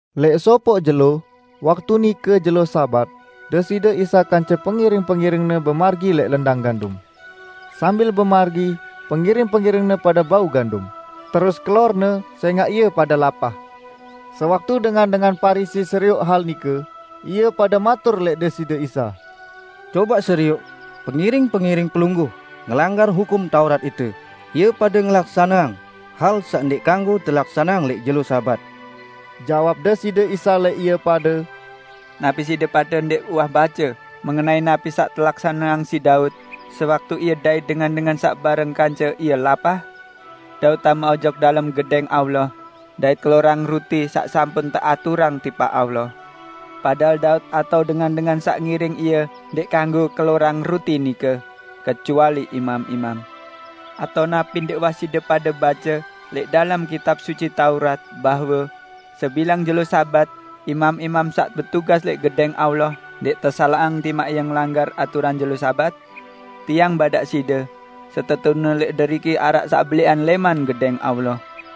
Lẽq sopoq jelo, waktu nike jelo Sabat, Deside Isa kance pengiring-pengiring-Ne bemargi lẽq lendang gandum. Sambil bemargi pengiring-pengiring-Ne pade bau gandum, terus kelorne sẽngaq ie pade lapah. Sewaktu dengan-dengan Parisi serioq hal nike, ie pade matur lẽq Deside Isa, "Cobaq serioq, pengiring-pengiring Pelungguh ngelanggar Hukum Taurat ite, ie pade ngelaksaneang hal saq ndẽq kanggo telaksaneang lẽq jelo Sabat." Jawab Deside Isa lẽq ie pade, "Napi side pade ndẽq uwah bace mengenai napi saq telaksaneang siq Daud sewaktu ie dait dengan-dengan saq bareng kance ie lapah? Daud tame ojok dalem Gedẽng Allah dait kelorang ruti saq sampun teaturang tipaq Allah. Padahal Daud atao dengan-dengan saq ngiring ie ndẽq kanggo kelorang ruti nike, kecuali imam-imam. Atao napi ndẽq uwah side pade bace lẽq dalem Kitab Suci Taurat bahwe sebilang jelo Sabat, imam-imam saq betugas lẽq Gedẽng Allah ndẽq tesalaqang timaq ie ngelanggar aturan jelo Sabat? Tiang badaq side: Setetune lẽq deriki araq saq belẽqan lẽman Gedẽng Allah.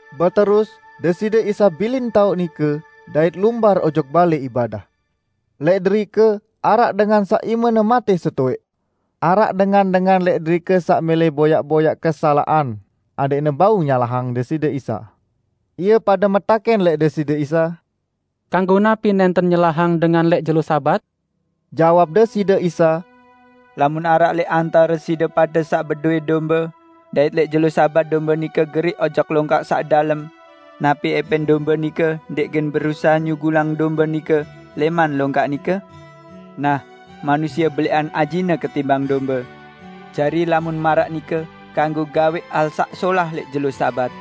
Beterus Deside Isa bilin taoq nike, dait lumbar ojok balẽ ibadah. Lẽq derike araq dengan saq imene matẽ setowẽq. Araq dengan-dengan lẽq derike saq mẽlẽ boyaq-boyaq kesalaqan adẽqne bau nyalahang Deside Isa. Ie pade metakẽn lẽq Deside Isa, "Kanggo napi nẽnten nyelahang dengan lẽq jelo Sabat?" Jawab Deside Isa, "Lamun araq lẽq antare side pade saq bedowẽ dombe, dait lẽq jelo Sabat dombe nike geriq ojok longkak saq dalem; napi ẽpẽn dombe nike ndẽq gen berusahe nyugulang dombe nike lẽman longkak nike? Nah, manusie belẽqan ajine ketimbang dombe! Jari lamun maraq nike kanggo gawẽq hal saq solah lẽq jelo Sabat!"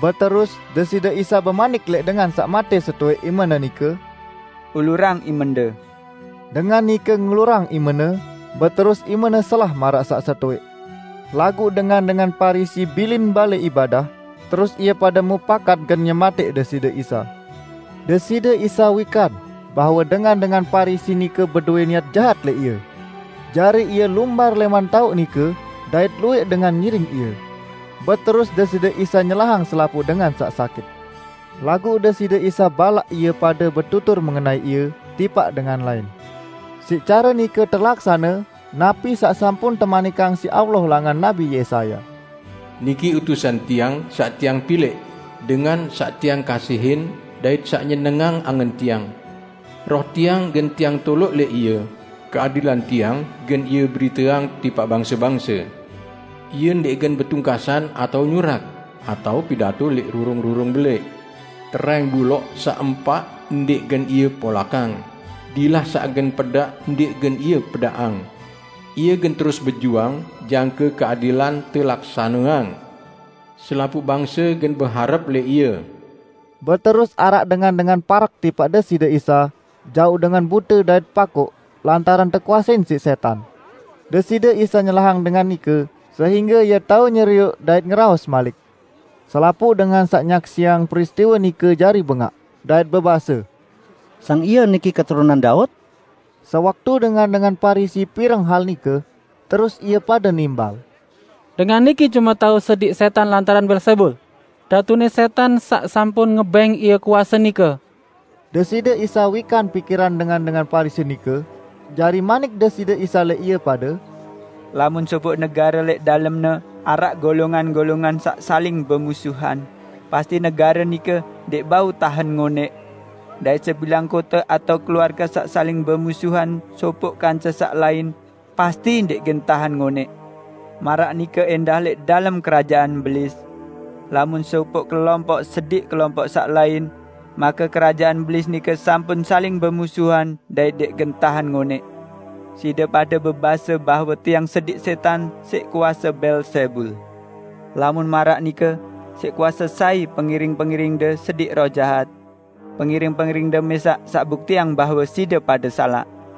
Beterus Deside Isa bemanik lẽq dengan saq matẽ setowẽq imene nike, "Ulurang imende." Dengan nike ngulurang imene, beterus imene selah maraq saq setowẽq. Laguq dengan-dengan Parisi bilin balẽ ibadah, terus ie pade mupakat gen nyematẽq Deside Isa. Deside Isa wikan bahwe dengan-dengan Parisi nike bedowẽ niat jahat lẽq Ie. Jari Ie lumbar lẽman taoq nike, dait luwẽq dengan ngiring Ie. Beterus Deside Isa nyelahang selapuq dengan saq sakit. Laguq Deside Isa balaq ie pade betutur mengenai Ie tipaq dengan lain. Siq care nike telaksane napi saq sampun temanikang siq Allah langan Nabi Yesaya, "Niki utusan Tiang saq Tiang pilẽq, Dengan saq Tiang kasihin dait saq nyenengang angen Tiang. Roh Tiang gen Tiang toloq lẽq Ie, keadilan Tiang gen Ie beriteang tipaq bangse-bangse. Ie ndẽq gen betungkasan atao nyurak, atao pidato lẽq rurung-rurung belẽq. Terẽng buloq saq empak ndẽq gen Ie polakang, dilah saq gen pedaq ndẽq gen Ie pedaqang. Ie gen terus bejuang jangke keadilan telaksaneang; selapuq bangse gen beharep lẽq Ie." Beterus araq dengan-dengan parek tipaq Deside Isa jauq dengan bute dait pakoq lantaran tekuasein siq sẽtan. Deside Isa nyelahang dengan nike sehingge ie tao nyerioq dait ngeraos malik. Selapuq dengan saq nyaksiang peristiwe nike jari bengaq, dait bebase, "Sang Ie niki keturunan Daud?" Sewaktu dengan-dengan Parisi pireng hal nike, terus ie pade nimbal, "Dengan niki cume tao sediq sẽtan lantaran Beelzebul, datune sẽtan saq sampun ngebẽng Ie kuase nike." Deside Isa wikan pikiran dengan-dengan Parisi nike, jari manik Deside Isa lẽq ie pade, "Lamun sopoq negare lẽq dalemne araq golongan-golongan saq saling bemusuhan, pasti negare nike ndẽq bau tahen ngonẽq. Dait sebilang kote atao keluarge saq saling bemusuhan sopoq kance saq lain, pasti ndẽq gen tahen ngonẽq. Maraq nike ẽndah lẽq dalem kerajaan Belis; lamun sopoq kelompoq sediq kelompoq saq lain, make kerajaan Belis nike sampun saling bemusuhan dait ndẽq gen tahen ngonẽq. Side pade bebase bahwe Tiang sediq sẽtan siq kuase Beelzebul. Lamun maraq nike siq kuase sai pengiring-pengiringde sediq roh jahat? Pengiring-pengiringde mẽsaq saq buktiang bahwe side pade salaq!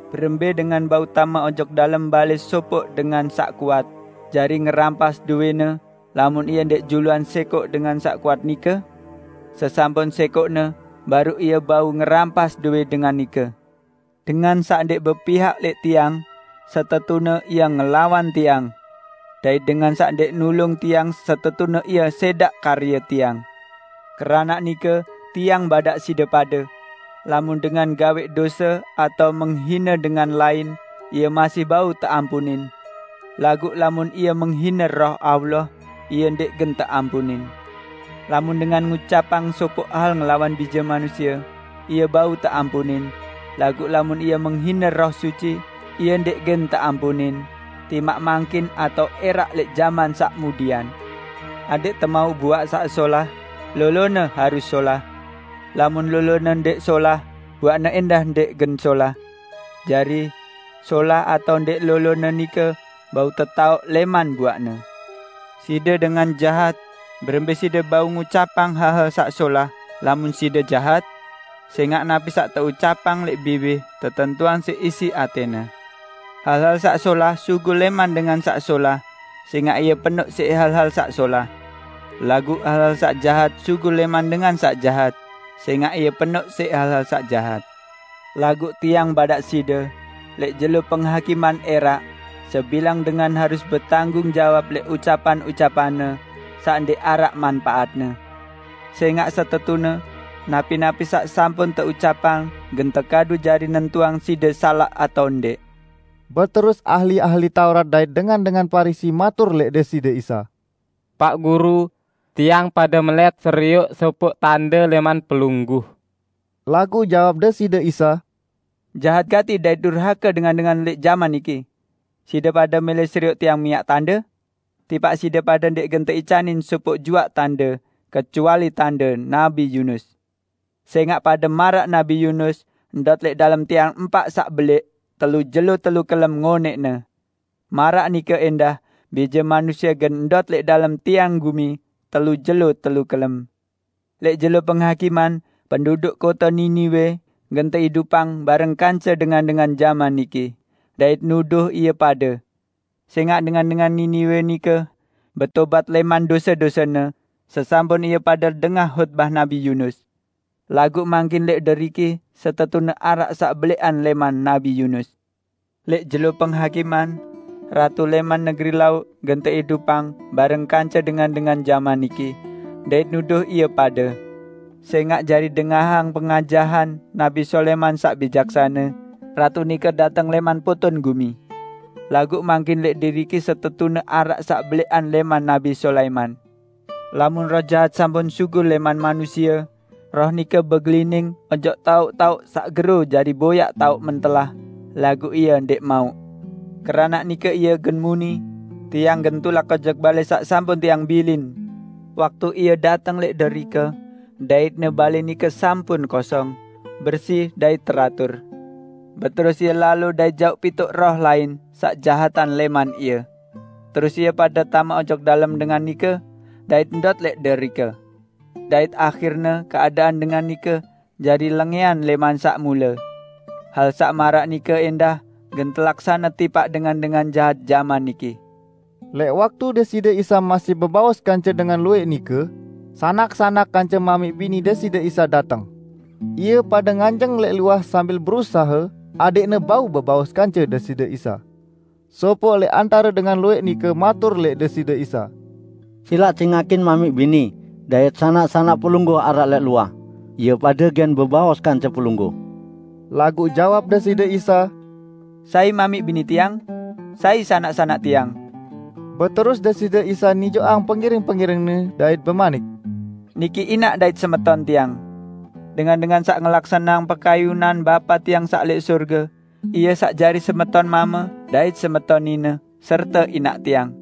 Berembẽ dengan bau tame ojok dalem balẽ sopoq dengan saq kuat, jari ngerampas dowẽne lamun ie ndẽq juluan sẽkoq dengan saq kuat nike? Sesampun sẽkoqne, baruq ie bau ngerampas dowẽ dengan nike. Dengan saq ndẽq bepihak lẽq Tiang, setetune ie ngelawan Tiang. Dait dengan saq ndẽq nulung Tiang setetune ie sẽdaq karye Tiang! Keranaq nike Tiang badaq side pade: Lamun dengan gawẽq dose atao menghine dengan lain, ie masih bau teampunin! Laguq lamun ie menghine Roh Allah, ie ndẽq gen teampunin! Lamun dengan ngucapang sopoq hal ngelawan Bije Manusie, ie bau teampunin, laguq lamun ie menghine Roh Suci, ie ndẽq gen teampunin, timaq mangkin atao ẽraq lẽq jaman saq mudian!" "Adẽq temauq buaq saq solah, lolone harus solah. Lamun lolone ndẽq solah buaqne ẽndah ndẽq gen solah. Jari, solah atao ndẽq lolone nike bau tetaoq lẽman buaqne. Side dengan jahat, berembẽ side bau ngucapang hal-hal saq solah lamun side jahat? Sẽngaq napi saq teucapang lẽq biwih tetentuang siq isi atẽne! Hal-hal saq solah sugul lẽman dengan saq solah sẽngaq ie penoq siq hal-hal saq solah. Laguq hal-hal saq jahat sugul lẽman dengan saq jahat sẽngaq ie penoq siq hal-hal saq jahat. Laguq Tiang badaq side: Lẽq jelo Penghakiman ẽraq, sebilang dengan harus betanggung jawab lẽq ucapan-ucapanne saq ndẽq araq manpaatne. Sẽngaq setetune, napi-napi saq sampun teucapang gen tekadu jari nentuang side salaq atao ndẽq." Beterus ahli-ahli Taurat dait dengan-dengan Parisi matur lẽq Deside Isa, "Paq Guru, tiang pade melẽt serioq sopoq tande lẽman Pelungguh." Laguq jawab Deside Isa, "Jahat gati dait durhake dengan-dengan lẽq jaman niki! Side pade mẽlẽ serioq Tiang miaq tande? Tipaq side pade ndẽq gen teicanin sopoq juaq tande kecuali tande Nabi Yunus. Sẽngaq pade maraq Nabi Yunus ndot lẽq dalem tian empaq saq belẽq telu jelo telu kelem ngonẽqne. Maraq nike ẽndah Bije Manusie gen ndot lẽq dalem tian gumi telu jelo telu kelem. Lẽq jelo Penghakiman, penduduk kote Niniwe gen teidupang bareng kance dengan-dengan jaman niki, dait nuduh ie pade. Sẽngaq dengan-dengan Niniwe nike betobat lẽman dose-dosene sesampun ie pade dengah hotbah Nabi Yunus. Laguq mangkin lẽq deriki setetune araq saq belẽqan lẽman Nabi Yunus! Lẽq jelo Penghakiman, ratu lẽman negeri Lauq gen teidupang bareng kance dengan-dengan jaman niki, dait nuduh ie pade. Sẽngaq jari dengahang pengajahan Nabi Sulaiman saq bijaksane, ratu nike dateng lẽman poton gumi. Laguq mangkin lẽq deriki setetune araq saq belẽqan lẽman Nabi Sulaiman!" "Lamun roh jahat sampun sugul lẽman manusie, roh nike begelining ojok taoq-taoq saq gero jari boyaq taoq mentelah, laguq ie ndẽq mauq. Keranaq nike ie gen muni, 'Tiang gen tulak ojok balẽ saq sampun tiang bilin.' Waktu ie dateng lẽq derike, daitne balẽ nike sampun kosong, bersi dait teratur. Beterus ie lalo dait jauq pituq roh lain saq jahatan lẽman ie. Terus ie pade tame ojok dalem dengan nike dait ndot lẽq derike. Dait ahirne keadaan dengan nike jari lengẽan lẽman saq mule. Hal saq maraq nike ẽndah gen telaksane tipaq dengan-dengan jahat jaman niki." Lẽq waktu Deside Isa masih bebaos kance dengan luwẽq nike, sanak-sanak kance mamiq bini Deside Isa dateng. Ie pade nganjeng lẽq luah sambil berusahe adẽqne bau bebaos kance Deside Isa. Sopoq lẽq antare dengan luwẽq nike matur lẽq Deside Isa, "Silaq cingakin mamiq bini dait sanak-sanak Pelungguh araq lẽq luah, ie pade gen bebaos kance Pelungguh." Laguq jawab Deside Isa, "Sai mamiq bini Tiang? Sai sanak-sanak Tiang?" Beterus Deside Isa nijoqang pengiring-pengiring-Ne dait bemanik, "Niki inaq dait semeton Tiang. Dengan-dengan saq ngelaksaneang pekayunan Bapa Tiang saq lẽq sorge ie saq jari semeton mame dait semeton nine serte inaq Tiang."